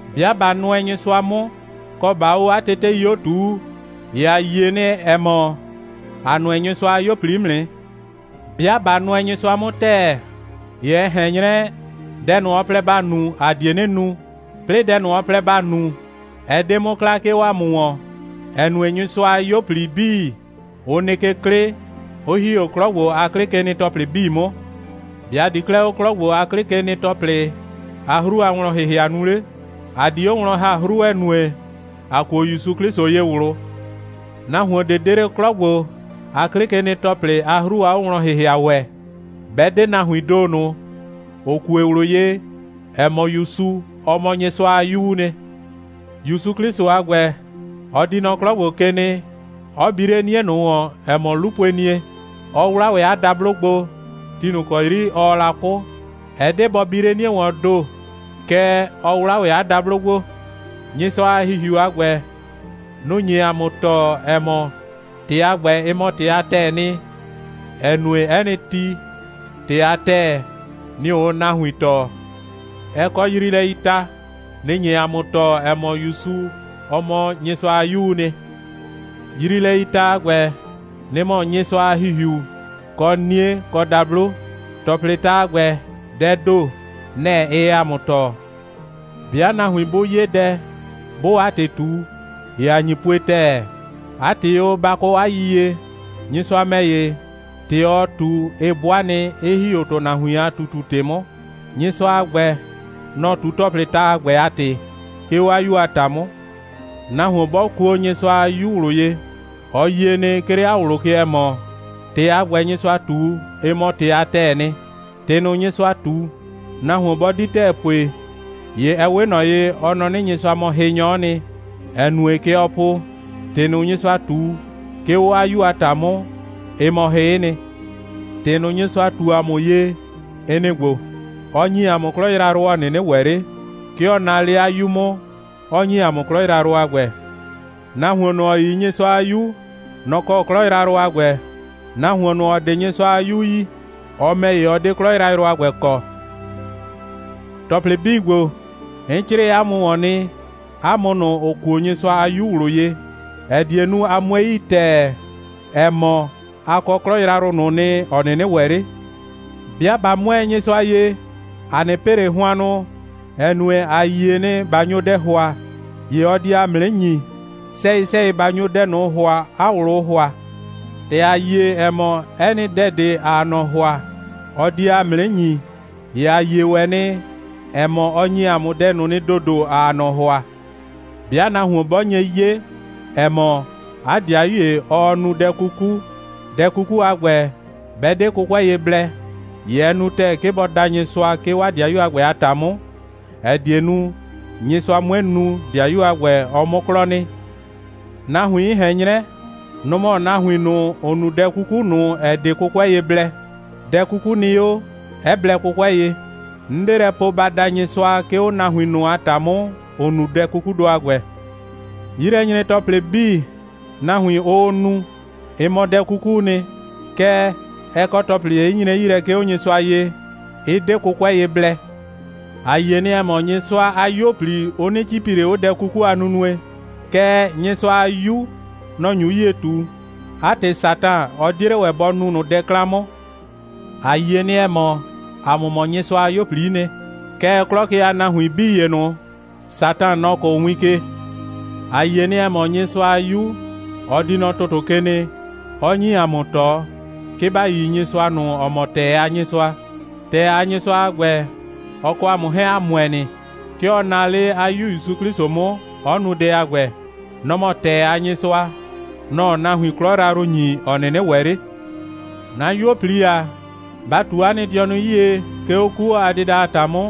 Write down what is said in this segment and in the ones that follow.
'Bɩa ꞊ba nʋɛ Nyɩsʋa 'mʋ, kɔ, ꞊baa 'o 'a tetei 'o ꞊tuu, ‑ye ‑a yie nɩ, ‑ɛ mɔ, ‑a nʋɛ Nyɩsʋa a 'yuo꞊pli 'mʋ nɩ. 'Bɩa ꞊ba nʋɛ Nyɩsʋa 'mʋ ‑tɛɛ, ‑ye ɛ ꞊hɛn 'nyrɛ, dɛ ꞊nʋ, ɔ plɛ ‑ba nu, ‑a die 'nɩ nu, 'plɩɩ dɛ ꞊nʋ, ɔ plɛ ‑ba nu, ɛ 'de 'mʋ kla, 'ke 'o ‑a mʋ ‑wɔn, ‑ɛ nue, Nyɩsʋa a 'yuo꞊pli 'bii, ʋ nɩ ke 'klɩ, 'ʋ ‑hi 'o 'klɔ ‑gbo a 'klɩkenɩ‑tɔplɩ 'bii 'mʋ. ‑Be' ‑a di 'klɛɛ 'o 'klɔ ‑gbo a 'klɩkenɩ‑tɔplɩ a 'hru a wlɔn‑hɩhɩa nu 'le? ‑A di 'o wlɔn ‑ha 'hru, ‑ɛ nue, ‑a kuo ‑Yusu 'Klɩsʋ ye ꞊wlʋ. Nahuon ꞊de 'de 'le 'klɔ ‑gbo a 'klɩkenɩ‑tɔplɩ a 'hru a 'owlɔn‑hɩhɩa ‑wɛ, 'bɛ 'de nahuiin ‑do ꞊nʋ, ‑ʋ kue ꞊wlʋ ye, ‑ɛ mɔ, ‑Yusu, ɔ mɔ Nyɩsʋa a 'Yuu nɩ. ‑Yusu 'Klɩsʋ a ‑gbɛ, ɔ di nɔ 'klɔ ‑gbo ke nɩ, 'ɔ bi 'le 'nie ꞊nʋ ‑wɔn, ‑ɛ mɔ 'lupuenie, 'ɔ 'wla ‑wɛ 'a dablo gbo, ti ꞊nʋ ‑kɔ 'yri ɔɔ la 'kʋ. Ɛ 'de bɔ bi 'le 'nie ‑wɔɔn ‑do, kɛɛ, ɔ 'wla ‑wɛ 'a dablo gbo. Nyɩsʋa a ‑Hihiu a ‑gbɛ, nʋ‑ nye ‑a mʋ tɔɔ, ‑ɛ mɔ, ‑tɩ a ‑gbɛ, ɩ mɔ ‑tɩ a ‑tɛɛ nɩ, ‑ɛ nue, 'ɛ nɩ ti, ‑tɩ a ‑tɛɛ, nɩ‑ ʋʋ nahuin tɔɔ. Ɛ kɔ yriilɛii ta. Nɩ‑ nye ‑a mʋ tɔɔ, ‑ɛ mɔ, ‑Yusu, ɔ mɔ Nyɩsʋa a 'Yuu nɩ. Yriilɛii ta a ‑gbɛ, nɩ‑ mɔ Nyɩsʋa a ‑Hihiu, kɔ 'nie, kɔ dablo. ‑Tɔplɩɩ ta a ‑gbɛ, dɛɛ ‑do, nɛ‑ ɩɩ ‑a mʋ tɔɔ. 'Bɩa nahuin 'bʋ 'ye dɛ, 'bʋʋ 'a ‑tɩ ꞊tu, ‑ye ‑a nyi pue ‑tɛɛ. 'A ‑tɩ o, ba kɔ 'a yiyie, Nyɩsʋa ‑mɛ ‑ye, ‑tɩ ɔɔ ꞊tu, ɩ 'bʋa nɩ, 'ɩ ‑hi 'o ‑tʋnahuin a ꞊tutu‑tɩ 'mʋ. Nyɩsʋa a ‑gbɛ, nɔ‑ ꞊tu ‑tɔplɩɩ ta a ‑gbɛ a ‑tɩ, 'ke 'o 'a 'Yu a ‑ta 'mʋ. Nahuon 'bɔ kuo Nyɩsʋa a 'Yu ꞊wlʋ ye, ɔ yie nɩ, 'ke 'le 'a ꞊wlʋ ke, ‑ɛ mɔ, ‑tɩ a ‑gbɛ, Nyɩsʋa ꞊tu, ɩ mɔ ‑tɩ a ‑tɛɛ nɩ. ‑Tɩ ꞊nʋ, Nyɩsʋa ꞊tu, nahuon 'bɔ 'di ‑tɛɛ pue, ‑ye ɛ 'we ꞊nɔ ye, ɔ nɔ 'nɩ, Nyɩsʋa mɔ hɩnyɔ'ɔ nɩ, ‑ɛ nue, kɛ ɔ po, ‑tɩ ꞊nʋ, Nyɩsʋa ꞊tu, 'ke 'o 'a 'Yu a ‑ta 'mʋ, ɩ mɔ hɩ'ɩ nɩ. ‑Tɩ ꞊nʋ, Nyɩsʋa ꞊tu ‑a mʋ ye, ɩ nɩ‑ ‑gbo: Ɔ ‑nyi ‑a mʋ 'klɔ yrayrʋ, ‑ɔ 'nɩnɩ ‑wɛ 'le. 'Ke ɔ naa 'le 'a 'Yu 'mʋ, 'ɔ ‑nyi ‑a mʋ 'klɔ yrayrʋ a ‑gbɛ. Nahuon ꞊nʋ, ‑ɔ yi Nyɩsʋa a 'Yu, nɔ‑ kɔ 'klɔ yrayrʋ a ‑gbɛ. Nahuon ꞊nʋ, ‑ɔ 'de Nyɩsʋa a 'Yu yi, ɔ ‑mɛ ‑ye, ɔ 'de 'klɔ yrayrʋ a ‑gbɛ kɔ. ‑Tɔplɩ 'bii ‑gbo, 'n 'crɩɩ 'a mʋ ‑wɔn nɩ, 'a mʋ ꞊nʋ, ‑ʋ kuo Nyɩsʋa a 'Yu ꞊wlʋ ye, ‑ɛ die nu, a 'mue yi ‑tɛɛ, ‑ɛ mɔ, a kɔ 'klɔ yrayrʋ ꞊nʋ nɩ, ‑ɔ 'nɩnɩ ‑wɛ 'le. 'Bɩa ꞊ba 'mʋɛɛ Nyɩsʋa ye, ‑a 'nɩ pɩ ꞊le hʋannʋ, ‑ɛ nue, ‑a yie nɩ, ꞊ba nyo dɛ ‑hʋa, ‑ye ɔ die ‑a mʋ 'nɩ ‑nyi, sɛyɩ‑sɛyɩ ꞊ba nyo dɛ ꞊nʋ ‑hʋa, 'a ꞊wlʋʋ ‑hʋa. ‑Tɛ ‑a yie, ‑ɛ mɔ, 'ɛ nɩ dɛ ꞊de, ‑aa ꞊nɔ ‑hʋa, ɔ die ‑a mʋ 'nɩ ‑nyi, ‑ye ‑a yie ‑wɛ nɩ, ‑ɛ mɔ, ɔ ‑nyi ‑a mʋ dɛ ꞊nʋ nɩ ‑dodo, ‑aa ꞊nɔ ‑hʋa. 'Bɩa nahuon 'bɔ nye 'ye, ‑ɛ mɔ, 'a ‑dɩayu ‑ye, ɔɔ nu dɛ 'kuku, dɛ 'kuku a ‑gbɛ, 'bɛ 'de 'kʋkʋɛ ye blɛ, ‑ye ɛ nu ‑tɛɛ, 'ke bɔ da Nyɩsʋa, 'ke 'o 'a ‑dɩayu a ‑gbɛ a ‑ta 'mʋ, ‑ɛ die nu, Nyɩsʋa 'mue nu, ‑dɩayu a ‑gbɛ, ɔ 'mʋ 'klɔ nɩ. Nahuin, 'n ꞊hɛn 'nyrɛ, nʋ‑ mɔ nahuin ꞊nʋ, ‑ʋ nu dɛ 'kuku ꞊nʋ, ‑ɛ 'de 'kʋkʋɛ ye blɛ. Dɛ 'kuku nɩ 'o, 'ɛ blɛ 'kʋkʋɛ ye. 'N 'de lɛ po, ba da Nyɩsʋa, 'ke 'o nahuin ꞊nʋ a ‑ta 'mʋ, ‑ʋ nu dɛ 'kukudʋ a ‑gbɛ. 'Yilɛnyre‑tɔplɩ 'bii, nahuin, ʋʋ nu, ɩ mɔ dɛ 'kukuu nɩ, kɛɛ, ɛ kɔ ‑tɔplɩ ‑ye, 'ɩ nyre 'yi lɛ, 'ke 'o Nyɩsʋa ye, 'ɩ 'de 'kʋkʋɛ ye blɛ. ‑A yie nɩ, ‑ɛ mɔ, Nyɩsʋa a 'yuo꞊pli, ʋ 'nɩ 'cipi ꞊le 'o dɛ 'kuku a nunue, kɛɛ, Nyɩsʋa a 'Yu, nɔ‑ nyu 'yie ꞊tu. 'A ‑tɩ, Satan, ɔ 'die 'le ‑wɛ bɔ nu ꞊nʋ dɛ 'klan 'mʋ. ‑A yie nɩ, ‑ɛ mɔ, ‑a mʋ mɔ Nyɩsʋa a 'yuo꞊pli'i nɩ. Kɛɛ, 'klɔ ke a nahuin 'bii ‑ye ꞊nʋ, Satan, nɔ‑ kʋʋ win ke. ‑A yie nɩ, ‑ɛ mɔ, Nyɩsʋa a 'Yu, ɔ di nɔ ‑tʋtʋ ke nɩ, 'ɔ ‑nyi ‑a mʋ ꞊tɔ, 'ke ‑ba yi Nyɩsʋa ꞊nʋ, ‑ɔ mɔ ‑tɛɛ a Nyɩsʋa. ‑Tɛɛ a Nyɩsʋa a ‑gbɛ, ɔ kɔ ‑a mʋ 'hɛɛn, ‑a ‑mʋɛ nɩ. 'Ke ɔ naa 'le 'a 'Yu ‑Yusu 'Klɩsʋ 'mʋ, 'ɔ nu dɛ a ‑gbɛ. Nɔ‑ mɔ ‑tɛɛ a Nyɩsʋa. Nɔ‑ɔ nahuin 'klɔ yrayrʋ ꞊nʋ ‑nyi, ‑ɔ 'nɩnɩ ‑wɛ 'le. 'Na 'yuo꞊pli ‑a, ba ꞊tu 'a nɩ dɩɔnʋ 'yie, 'ke 'o 'kuo a dɩda a ‑ta 'mʋ,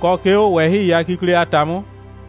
kɔ, 'ke 'o ꞊wɛhɩi a kikle a ‑ta 'mʋ.